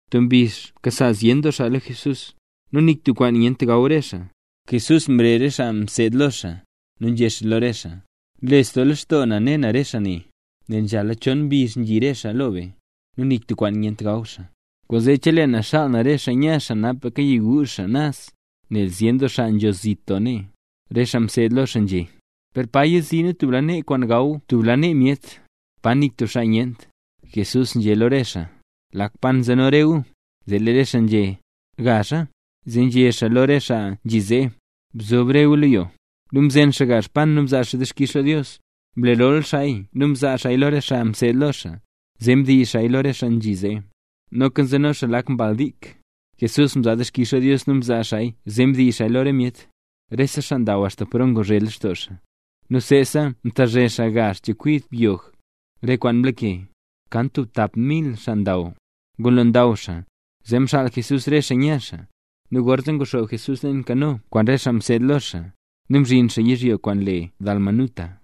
Tub mbizh mkasa zyen doo xaa lo Jesús, nu nik tub kwaan nyent gaw re xaa. Jesús mrezh re xaa mseed lo xaa, nu nzhé xaa lo re xaa: —Nles doo lextoo na ne na re xaa ne, nel nzhala chon mbizh nzhi re xaa lo be, nu nik tub kwaan nyent gaw xaa. Kwaanzee chelee na xaal na re xaa nya xaa, napaka yiguuzh xaa naz, nel zyen doo xaa nzho zit doo nee. Re xaa mseed lo xaa nzhé: —¿Per pa yixii nu tub lanee kwaan gaw tub lanee myet, pa nik tub xaa nyent? Jesús nzhé lo re xaa: —¿Lak pan nzeno re gu? Zee lee re xaa nzhé: —Gazha. Zee nzhé xaa lo re xaa nzhi zee: —Bzob re gu lo yo. Nu mzen xaa gazh pan, nu mzaa xaa dixkix lo Dios. Mlerol xaaya nu mzaa xaaya lo re xaa mseed lo xaa, zee mdiiz xaaya lo re xaa nzhi zee. Noka nzeno xaa lak mbal dik. Jesús mzaa dixkix lo Dios nu mzaa xaaya zee mdiiz xaaya lo re myet. Rese xaa ndaw axta paro nguzhe lextoo xaa, nu seesa mtazhe xaa gazh chekwid byog, re kwaan mlake. Kan tap mil xaa ndaw. Ngulo ndaw xaa, zee mxaal Jesús re xaa nya xaa. Nu gorzee nguxoob Jesús leen kano kwaan re xaa mseed lo xaa, nu mzhin xaa yizhyo kwaan le Dalmanuta.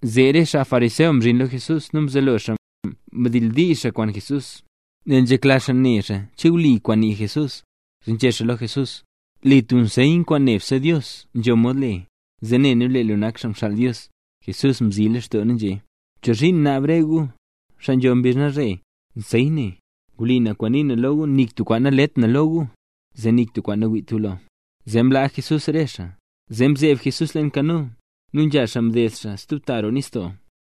Zee re xaa fariseo mzhin lo Jesús, nu mzelo xaa mdildiizh xaaya kwaan Jesús. Nel nzhekla xaa ne xaa che wli kwaan nii Jesús, zee nzhé xaa lo Jesús: —Le tub nseyn kwaan nebse Dios nzho mod le, zee ne nu lee lu nak xaa mxaal Dios. Jesús mzilextoo nu nzhé: —¿Chozhiin naab re gu, xaa nzho mbizh nalzhe, nseyn ne? Wli na kwaan nii na lo gu, nik tub kwaan nalet na lo gu, zee nik tub kwaan nawiit gu lo. Zee mlaa Jesús re xaa, nu mzeeb Jesús leen kano, nu nzha xaa mded xaa stub ta roo nistoo.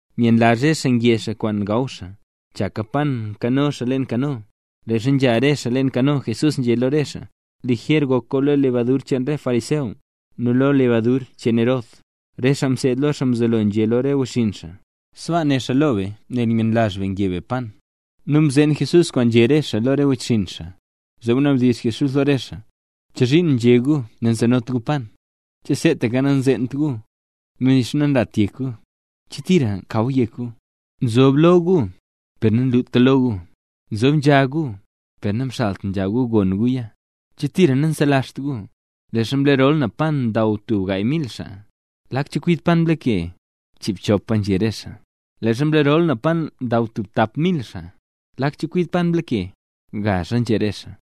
Myenlazh re xaa nge xaa kwaan gaw xaa, chaka pan nkano xaa leen kano. Leezha nzha re xaa leen kano, Jesús nzhé lo re xaa: —Lijer gok gu lo lebadur cheen re fariseo, nu lo lebadur cheen Herod. Re xaa mseed lo xaa mzelo nzhé xaa lo wechxinn xaa: —Sbaa né xaa lo be nel myenlazh be nge be pan. Nu mzeen Jesús kwaan nzhé re xaa lo re wechxinn xaa, zee mnabdizh Jesús lo re xaa: —¿Chozhiin nzhé gu nanzenot gu pan? ¿Che seetaka nanzeent gu, nu nixa nanlata yek gu? ¿Che tira mkaw yek gu? Nzob lo gu, per nanluta lo gu; nzob nzha gu, per namxalt nzha gu gon guya. ¿Che tira nanselazht gu? Leezha mlerol na pan ndaw tub gaay mil xaa, ¿lak chekwid pan mlake? —Chiibchopa —nzhé re xaa. —Leezha mlerol na pan ndaw tub tap mil xaa, ¿lak chekwid pan mlake? —Gazha —nzhé re xaa.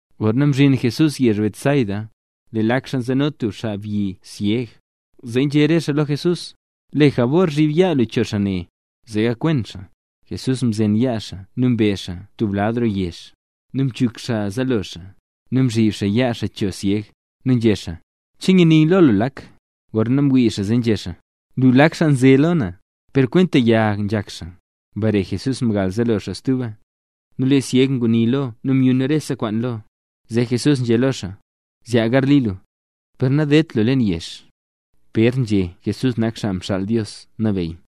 Gorna mzhin Jesús yezh Betsaida, lee lak xaa nzeno tub xaabyi syeg. Zee nzhé re xaa lo Jesús: —Le jabor, zhib yaa lu cho xaa ne, zee gakwen xaa. Jesús mzen yaa xaa nu mbe Jesús xaa tub lad roo yezh. Nu mchuk xaa zaalo xaa, nu mzhib xaa yaa xaa cho syeg, nu nzhé xaa: —¿Che nyini lu lak? Gorna mwii xaa zee nzhé xaa: —Nlu lak xaa nzhaze lo na, per kwenta yag nzhak xaa. Mbare Jesús mgal zaalo xaa stuba, ¡nu lee syeg nguni lo, nu myun rese kwaan lo xaa! Zee Jesús nzhé lo xaa: —Zyaa garli lu, per nadedt lu leen yezh. Pér nzhé “Jesús nak Xaa Mxaal Dios Nabeyy”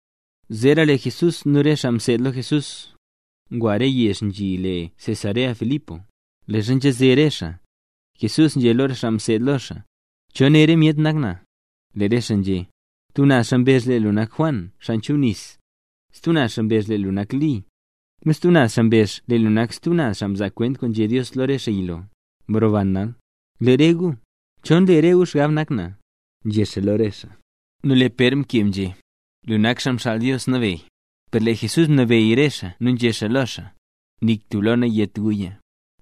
Zeera lee Jesús nu re xaa mseed lo Jesús, ngwa re yezh yizhyo le Cesarea-Filipo. Leezha nzhaze re xaa, Jesús nzhé lo re xaa mseed lo xaa: —¿Cho né re myet nak na? Lee re xaa nzhé: —Tub naz xaa mbezh lee lu nak Juan Xaa Nchubnis, stub naz xaa mbezh lee lu nak Li, nu stub naz xaa mbezh lee lu nak stub re xaa mzaa kwent kwaan nzhé Dios lo lee xaa yilo, mroban nal. —Lee re guya, ¿cho nle re gu xgab nak na? —nzhé xaa lo re xaa. Nu lee Pér mkeb nzhé: —Lu nak Xaa Mxaal Dios Nabeyy. Per lee Jesús mnabeyy re xaa nu nzhé xaa lo xaa: —Nik tub lo nayét guya.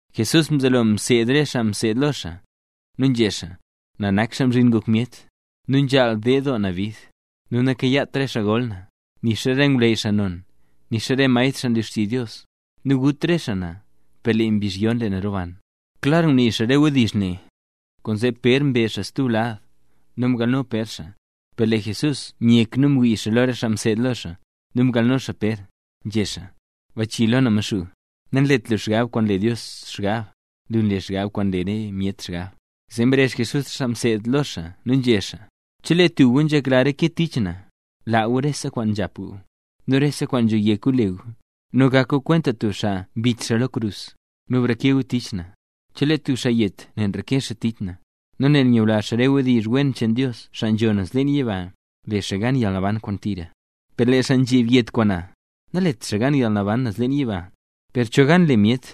Jesús mzelo mseed re xaa mseed lo xaa, nu nzhé xaa: —Na nak Xaa Mzhin Ngok Myet. Nu nzhaal ded doo na bid, nu nakayaat re xaa gol na, nixa re ngwleyy xaa non, nixa re maestr xaa nlu xtizh Dios. Nu gut re xaa na, per lee mbizh yon lee na roban. Klar ngunii xaa re wdizh ne, kwaanzee Pér mbe xaa tub lad, nu mgalno Pér xaa. Per lee Jesús myek nu mwii lo re xaa mseed lo xaa, nu mgalno xaa Pér, nzhé xaa: —¡Bachii lo na Maxuu! Nanlet lu xgab kwaan nle Dios xgab; lu nle re xgab kwaan nle re myet xgab. Zee mrezh Jesús re xaa mseed lo xaa nu nzhé xaa: —Chelee tub gu nzhekla reke tich na, laa gu rese kwaan nzhap gu, nu rese kwaan nzho yek gu le gu, nu gak gu kwenta tub xaa mbit xaa lo krus, nu breke gu tich na. Chelee tub xaa yet nel nreke xaa tich na, nu nel ngula xaa re wdizh wen cheen Dios xaa nzho naz leen yiba, le xaa gan yalnaban kwaan tira. Per lee xaa nzheb yet kwaan na, nalet xaa gan yalnaban naz leen yiba. Per cho gan le myet;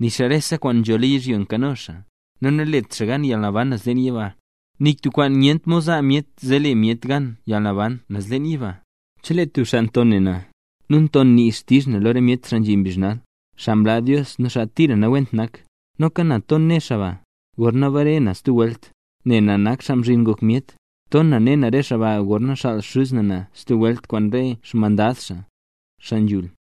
nixa rese kwaan nzho lo yizhyo nkano xaa, nu nalet xaa gan yalnaban naz leen yiba. Nik tub kwaan nyent mod zaa myet zee le myet gan yalnaban naz leen yiba. Chelee tub xaa nton ne na, nu nton nii xtizh na lo re myet xaa nzhi mbizh nal, xaa mlaa Dios nu xaa tira nawent nak, noka na ton na ne na xaa ba, gorna bare na stub welt, nel na nak Xaa Mzhin Ngok Myet. Ton na ne na xaa ba gorna xaal Xuz na na stub welt kwaan re xmandad xaa, xaa nambey.